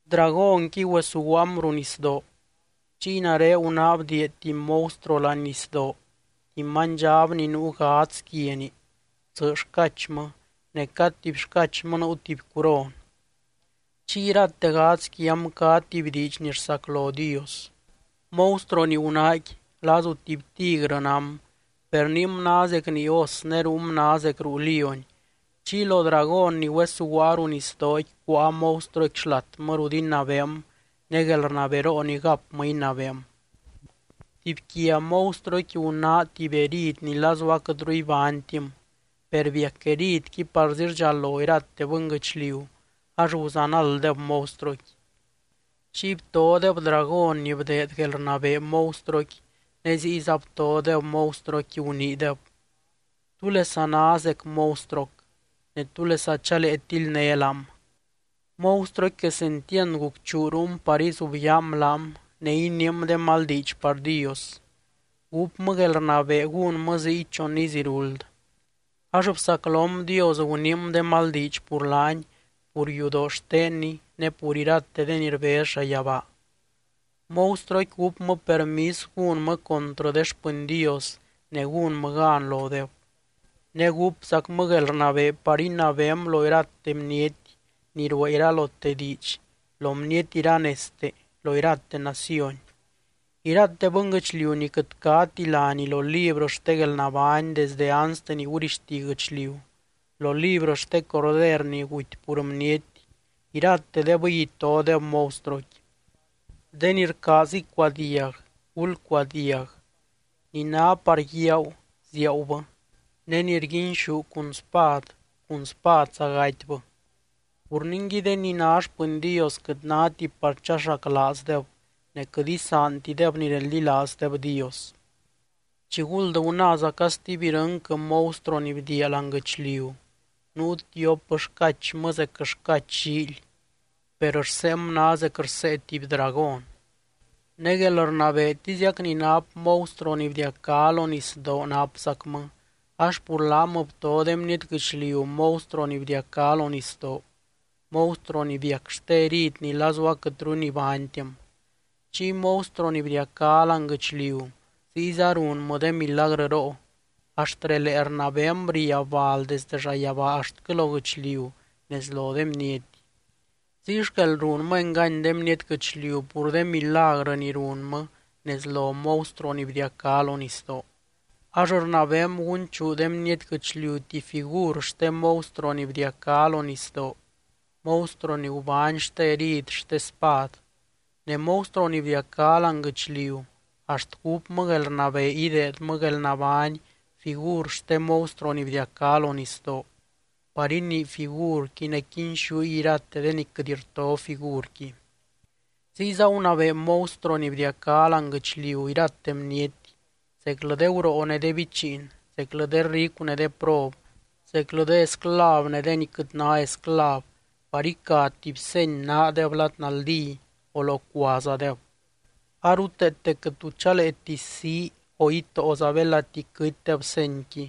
Dragónqui güesuguaam ruu nisdoo. Chiy nare gunáa bdiia tuby monstruo láani nisdoo, tuby manydxab ni nuu gadz quiani, tsɨ xcachmɨ ne cad tuby xcachmɨ nuu tuby curon, chiy irate gadz quiam cá tuby diidx ni rsaclo Dios. Monstruo ni gunáaqui lazu tuby tigrɨ nám, per niim ná zec nii os ne ruum ná zec ruu lióny. Chiy lo dragón ni güesuguaa ruu nisdooqui cuáa monstruoqui xlatmɨ rut inabeem ne guelrnaberoo ni gapmɨ inabeem. Tuby quia monstruoqui gunáa tuby herid ni lazu aquɨtru ibánytim, per biac heridqui parzi rdxalo irate bɨnguɨchliu ax guzanalddeb monstruoqui. Chiy btodeb dragón ni bdeed guelrnabee monstruoqui ne ziyza btodeb monstruoqui, guniideb: —¿Túlesa ná zec monstruoc, ne túlesa chalee tildné laam? Monstruoqui quesentiand gucchuu ruum par izubyaam laam, ne iniim de mal diidx par Dios. Gúpmɨ guelrnabee gúnmɨ ziy chon iz iruld. Ax bsaclom Dios, guniim de mal diidx pur laany, pur yudoo xtenny ne pur irate de ni rbez llayabaa. Monstruoqui gúpmɨ permis gúnmɨ contrɨ de xpɨny Dios ne gúnmɨ gan lodeb. Ne gúpzacmɨ guelrnabee par inabeem lo iralote bniety ni ruee iralote diidx, lo bniety iranezte, lo irate naciony. Irate bɨnguɨchliu ni quɨt cáti láni lo librɨ xte guelnabány desdɨ anste ni gurixti guɨchliu, lo librɨ xte Corder ni guty pur bniety, iratedebɨy itodeb monstruoqui. De ni rcaaz icuadiag, gulcuadiag. Ni ná par guiaagu, ziaagubɨ. Ne ni rguinxú cun spad, cun spadza gatybɨ. Pur ningui, de ni ná xpɨny Dios quɨt náti par chaxaclaazdeb ne quɨt isaantideb ni reldilaazdeb Dios. Chiguld gunáazaca stuby irɨnquɨ monstruo ni bdiia láani guɨchliu. Nuu tiop xcachmɨ zec xcach llíily, per rseem ná zec rsee tuby dragón. Ne guelrnabeetiziac ni nap monstruo ni bdiacá lo nisdoo napzacmɨ ax pur laam bto de bniety guɨchliu monstruo ni bdiacá lo nisdoo, monstruo ni biac xte herid ni lazu aquɨtru nibánytim. Chiy monstruo ni bdiacá láani guɨchliu ziyza runmɨ de milagrɨroo, axt relee rnabeem riab bal desde llayabaa axtquɨ lo guɨchliu nez lo de bniety. Ziy xquel runmɨ engany de bniety guɨchliu pur de milagrɨ ni runmɨ nez lo monstruo ni bdiacá lo nisdoo, ax rnabeem gunchuu de bniety guɨchliu tuby figur xte monstruo ni bdiacá lo nisdoo, monstruo ni gubány xte herid xte spad. Ne monstruo ni bdiacá láani guɨchliu axt gúpmɨ guelrnabee ideedmɨ guelnabány figur xte monstruo ni bdiacá lo nisdoo, par inii figurqui ne quinxúy irate de ni quɨt rto figurqui. Ziyza gunabee monstruo ni bdiacá láani guɨchliu irate bniety, zeclɨ de guroo ne de bichiin, zeclɨ de ricu ne de prob, zeclɨ de esclav ne de ni quɨt ná esclav par ica tuby seny naadeb lad naldí o locuazadeb. A ruteete quɨt tu chaleeti sii o itóoza belati quɨtydeb senyqui,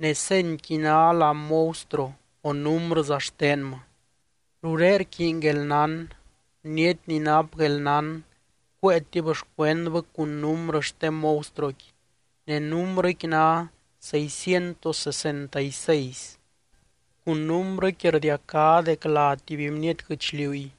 ne senyqui ná lá monstruo o númbrɨza xtenmɨ. Ruré rquiiny guelnán. Bniety ni nap guelnán cuéetib xcuendbɨ cun númbrɨ xte monstruoqui, ne númbrɨqui ná seiscientos sesenta y seis. Cun númbrɨqui rdiacá dec lá tuby bniety guɨchliuy.